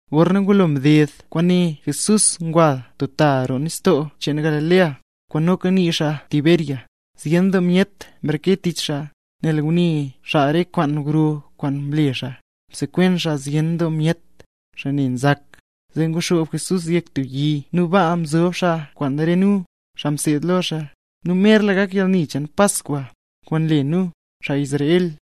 Gorna ngulo mded kwaane Jesús ngwa stub ta roo nistoo cheen Galilea, kwaan noka nii xaa Tiberias. Zyen doo myet mreke tich xaa, nel ngune xaa re kwaan gro kwaan mle xaa; msekwen xaa zyen doo myet, xaa ne nzak. Zee nguxoob Jesús yek tub yi nu baa mzob xaa kwaan re nu, xaa mseed lo xaa. Nu merla gak yalni cheen Paskwa, kwaan nle nu, xaa Israel.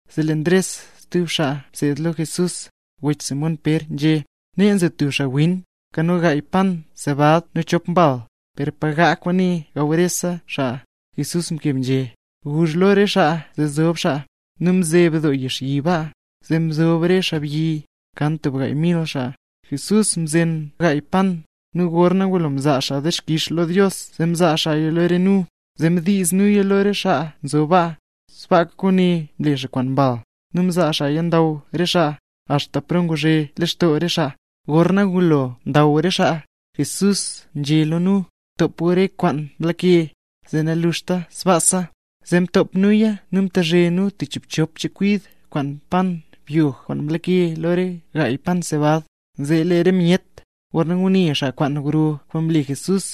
Zee lee Ndres stub xaa mseed lo Jesús, wech Simón Pér, nzhé: —Nee nzo tub xaawin, nkano gaay pan sebad nu chop mbal; ¿per pa gaa kwaane gaw rese xaa? Jesús mkeb nzhé: —Guzh gu lo re xaa zee zob xaa. Nu mzeb doo yixyi baa, zee mzob re xaabyi, kan tub gaay mil xaa. Jesús mzen gaay pan, nu gorna ngulo mzaa xaa dixkix lo Dios zee mzaa xaaya lo re nu, zee mdiiz nuya lo re xaa nzob baa; sbaaka kwaane mle xaa kwaan mbal, nu mzaa xaaya ndaw re xaa, axta paro nguzhe lextoo re xaa. Gorna ngulo ndaw re xaa, Jesús nzhé lo nu: —Btop gu re kwaan mlake, zee naluxta sbaasa. Zee mtop nuya nu mchezhe nu chiibchop chekwid kwaan pan byog kwaan mlake lo re gaay pan sebad. Zee lee re myet, gorna ngune xaa kwaan gro kwaan mle Jesús,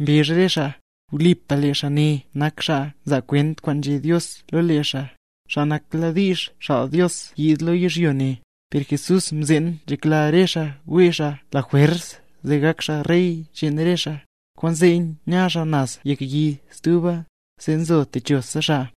mbezh re xaa: —Wlipa lee xaa ne nak xaa nzaa kwent kwaan nzhé Dios lo lee xaa, xaa nakladiizh xaal Dios yiid lo yizhyo ne. Per Jesús mzeen nzhekla re xaa wee xaa xaa lajwers, zee gak xaa rey cheen re xaa, kwaanzee nya xaa naz yek yi stuba, zee zo techo xaa.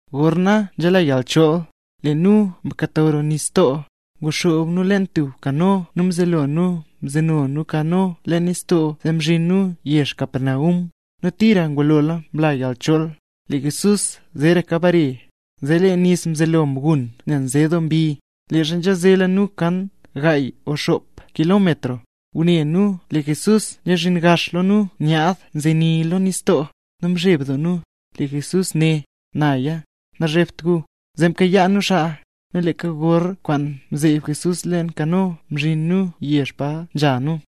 Gorna nzela yalchool, lee nu mkato roo nistoo, nguxoob nu leen tub kano nu mzelo nu mzeno nu kano leen nistoo zee zhin nu yezh Capernaum. Nu tira ngulola mla yalchool, lee Jesús zeeraka bare. Zee lee nis mzelo mgun nel nze doo mbi. Leezha nzhazela nu kan gaay o xop kilómetro, ngune nu lee Jesús nzezhin gaxla lo nu nyaad zenii lo nistoo, nu mzheb doo nu. Lee Jesús né: —¡Naya, nazhebt gu! Zee mkayaa nu xaa, nu leeka gor kwaan mzeeb Jesús leen kano, mzhin re nu yezh pa nzha nu.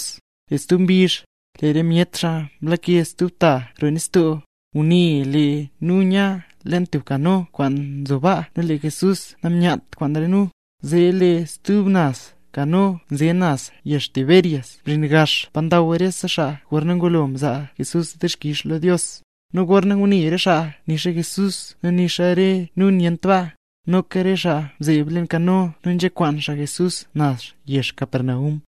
Lee stub mbizh, lee re myet xaa mlake stub ta roo nistoo, ngune lee nu nya leen tub kano kwaan nzo baa nu lee Jesús namyat kwaan re nu. Zee lee stub naz kano nze naz yezh Tiberias mzhin gax pa ndaw rese xaa gorna ngulo mzaa Jesús dixkix lo Dios. Nu gorna ngune re xaa nixa Jesús nu nixa re nu nyent baa, noka re xaa mzeeb leen kano nu nzhakwaan xaa Jesús naz yezh Capernaum.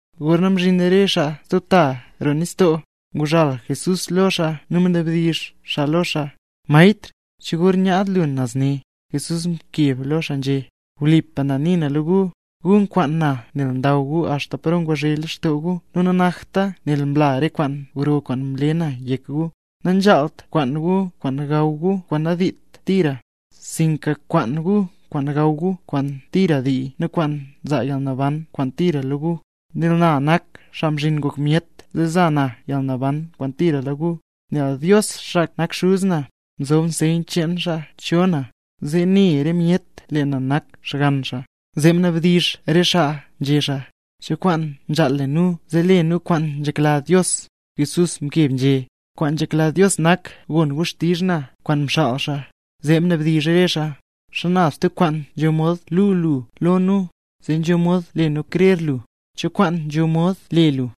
Gorna mzhin re xaa stub ta roo nistoo, nguzhal Jesús lo xaa nu mnabdizh xaa lo xaa: —Maestr, ¿cho gor nyaad lu nazre? Jesús mkeb lo xaa nzhé: —Wlipa na nii na lo gu, gu nkwaan na nel ndaw gu axta paro nguzhe lextoo gu nu nanakta nel mla re kwaan gro kwaan mle na yek gu. Nanzhaalt kwaan gu kwaan gaw gu kwaan nandiit tira, sinka kwaan gu kwaan gaw gu kwaan tira ndii nu kwaan nzaa yalnaban kwaan tira lo gu. Nel na nak Xaa Mzhin Ngok Myet zee za na yalnaban kwaan tira lo gu, nel Dios, xaa nak Xuz na, mzob sey cheen xaa cho na, zee ne re myet lee na nak Xgann xaa. Zee mnabdizh re xaa nzhé xaa: —¿Cho kwaan nzhaal le nu zee le nu kwaan nzhekla Dios? Jesús mkeb nzhé: —Kwaan nzhekla Dios nak, gon gu xtizh na, xaa kwaan mxaal xaa. Zee mnabdizh re xaa: —¿Xana tub kwaan nzho mod luu lu lo nu, zee nzho mod le nu krer lu? ¿Cho kwaan nzho mod le lu?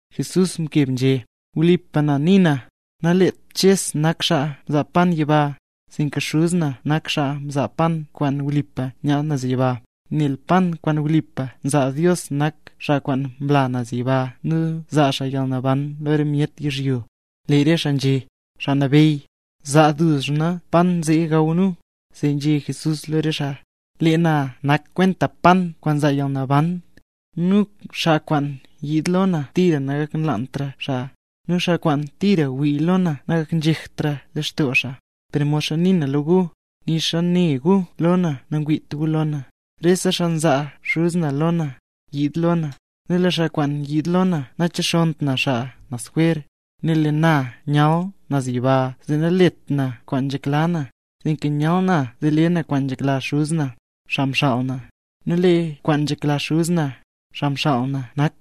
Jesús mkeb nzhé: —Wlipa na nii na, naleet Ches nak xaa mzaa pan yiba, sinka Xuz na nak xaa nzaa pan kwaan wlipa nyaad naz yiba. Nel lee pan kwaan wlipa nzaa Dios nak xaa kwaan mla naz yiba, nu nzaa xaa yalnaban lo re myet yizhyo. Lee re xaa nzhé: —Xaa Nabeyy, zaa duzna pan zee gaw nu. Zee nzhé Jesús lo re xaa: —Lee na nak kwenta pan kwaan nzaa yalnaban. Nu xaa kwaan yiid lo na tira nagaknlaantra xaa; nu xaa kwaan tira wii lo na nagaknzhektra lextoo xaa. Per modxa nii na lo gu, nixa ne gu lo na nangwiit gu lo na. Rese xaa nzaa Xuz na lo na, nyiid lo na, nu lee xaa kwaan nyiid lo na nachexonnt na xaa naz jwer. Nel lee na nyal naz yiba zee nalet na kwaan nzhekla na, sinka nyal na zee le na kwaan nzhekla Xuz na, xaa mxaal na. Nu lee kwaan nzhekla Xuz na, xaa mxaal na nak,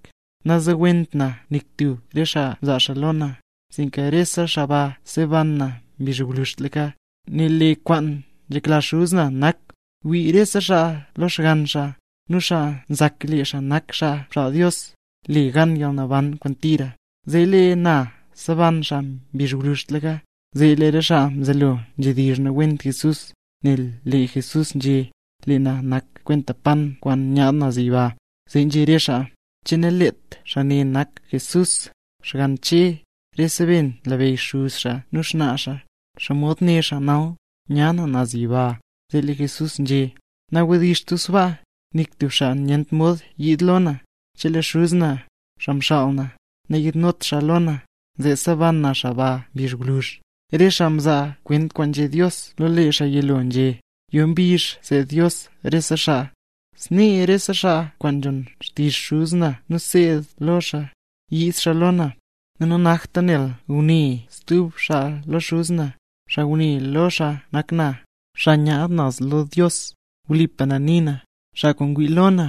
nazowent na nik tub re xaa mzaa xaa lo na, sinka rese xaa ba seban na mbizh gwluzhtlaka. Nel lee kwaan nzhekla Xuz na nak, wii rese xaa lo Xgann xaa; nu xaa nzak lee xaa nak xaa mxaal Dios, le gan yalnaban kwaan tira; zee lee na seban xaa mbizh gwluzhtlaka. Zee lee re xaa nzelo nzhedizh nawent Jesús, nel lee Jesús nzhé: “Lee na nak kwenta pan kwaan nyaad naz yiba”. Zee nzhé re xaa: —¿Che naleet xaa ne nak Jesús, xgann Che? Rese be nlabeyy xuz xaa nu xnaa xaa. ¿Xomod né xaa nal: “Nyaad na naz yiba”? Zee lee Jesús nzhé: —Nawdizht gu sbaa. Nik tub xaa nyent mod yiid lo na, chelee Xuz na, xaa mxaal na, nayiidnot xaa lo na; zee seban na xaa ba mbizh gwluzh. Re xaa mzaa kwent kwaan nzhé Dios lo lee xaa yilo nzhé xaa: “Yo mbizh seed Dios rese xaa”. Snee rese xaa kwaan nzhon xtizh Xuz na nu nseed lo xaa, nyiid xaa lo na. ’Nu nanakta nel ngune stub xaa lo Xuz na; xaa ngune lo xaa nak na, xaa nyaad naz lo Dios. Wlipa na nii na, xaa kwaan ngwii lo na,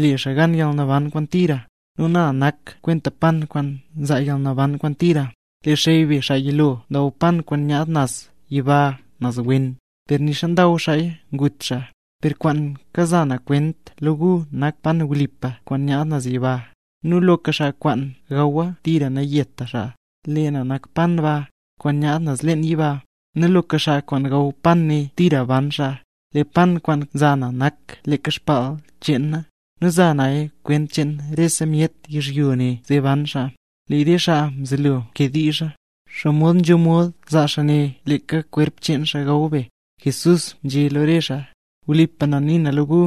le xaa gan yalnaban kwaan tira. Lee na nak kwenta pan kwaan nzaa yalnaban kwaan tira. Re xey be xaa yilo ndaw pan kwaan nyaad naz yiba naz wen, per nixa ndaw xaaya ngut xaa. Per kwaan kaza na kwent lo gu nak pan wlipa kwaan nyaad naz yiba, nu loka xaa kwaan gawa tira nayeta xaa. Lee na nak pan ba, kwaan nyaad na naz leen yiba; nu loka xaa kwaan gaw pan ne tira ban xaa. Lee pan kwaan za na nak leeka baal cheen na, nu za naya kwent cheen rese myet yizhyo ne zee ban xaa. Lee re xaa mzelo mkediizha: —¿Xomod nzho mod zaa xaa ne leeka kwerp cheen xaa gaw be? Jesús nzhé lo re xaa: —Wlipa na nii na lo gu,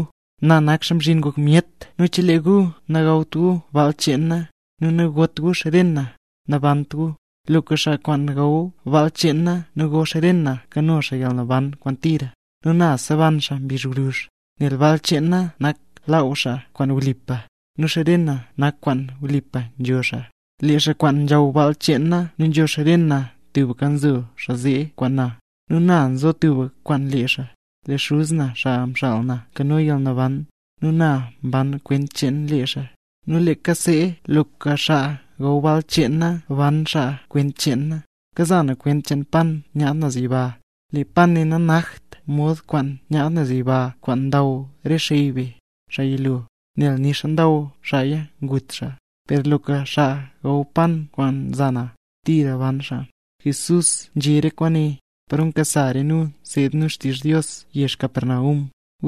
na nak Xaa Mzhin Ngok Myet nu chelee gu nagawt gu baal cheen na, nu nagot gu xren na, nabant gu. Loka xaa kwaan gaw baal cheen na nu go ren cheen na nkano xaa yalnaban kwaan tira, nu na seban xaa mbizh gwluzh. Nel baal cheen na nak laaw xaa kwaan wlipa, nu xren na nak kwaan wlipa nzho xaa. Lee xaa kwaan nzhaw baal cheen na nu nzho xren na tubka nzo xaa zee kwaan na, nu na nzo tubka kwaan lee xaa. Lee Xuz na, xaa mxaal na nkano yalnaban, nu na mban kwent cheen lee xaa; nu leeka see, loka xaa gaw baal cheen na, ban xaa kwent cheen na. Kaza na kwent cheen pan kwaan nyaad naz yiba. Lee pan ne nanakt mod kwaan nyaad naz yiba kwaan ndaw re xey be, xaa yilo, nel nixa ndaw xaaya ngut xaa, per loka xaa gaw pan kwaan za na, tira ban xaa. Jesús nzhé re kwaane, paro nkasa re nu nseed nu xtizh Dios yezh Capernaum.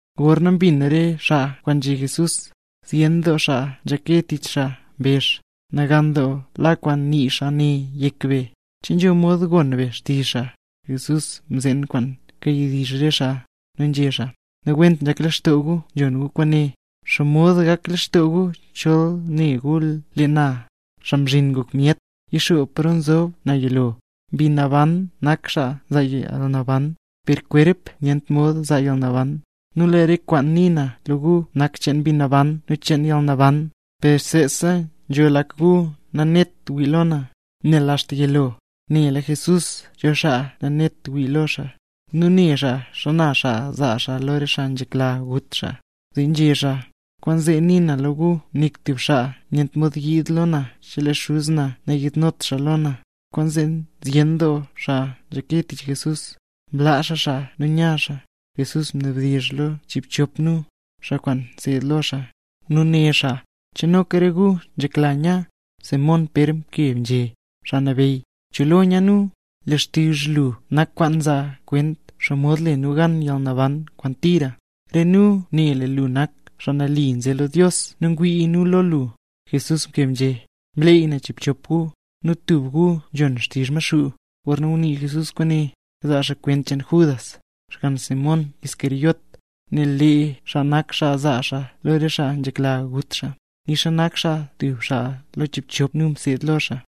Gorna mbin re xaa kwaan nzhé Jesús, zyen doo xaa nzhake tich xaa mbezh: —Nagan doo la kwaan nii xaa ne yek be; ¿che nzho mod gon be xtizh xaa? Jesús mzeen kwaan kawdizh re xaa, zee nzhé xaa: —Nawent nzhak lextoo gu nzhon gu kwaane. ¿Xomod gak lextoo gu chol ne gu lee na, Xaa Mzhin Ngok Myet, yixoob paro nzob na yilo? Mbi Naban nak xaa nzaa yalnaban, per kwerp nyent mod zaa yalnaban. Nu lee re kwaan nii na lo gu nak cheen Mbi Naban nu cheen yalnaban. Per seesa nzho lak gu nanet wii lo na. Nel axta yilo, nela Jesús cho xaa nanet wii lo xaa, nu ne xaa xana xaa zaa xaa lo re xaa nzhekla gut xaa. Zee nzhé xaa: —Kwaanzee nii na lo gu nik tub xaa nyent mod yiid lo na chelee Xuz na nayiidnot xaa lo na. Kwaanzee zyen doo xaa nzhake tich Jesús, mlaa xaa xaa nu nya xaa. Jesús mnabdizh lo chiibchop nu, xaa kwaan mseed lo xaa, nu né xaa: —¿Che noka re gu nzhekla nya? Simón Pér mkeb nzhé: —Xaa Nabeyy, ¿cho lo ya nu? Lee xtizh lu nak kwaan nzaa kwent xomod le nu gan yalnaban kwaan tira. Re nu ne lee lu nak Xaa Nali nze lo Dios nu ngwii nu lo lu. Jesús mkeb nzhé: —Mleey na chiibchop gu, nu tub gu nzhon xtizh Maxuu. Gorna ngunii Jesús kwaane, kazaa xaa kwent cheen Judas, xgann Simón Iscariote, nel lee xaa nak xaa zaa xaa lo re xaa nzhekla gut xaa, nixa nak xaa tub xaa lo chiibchop nu mseed lo xaa.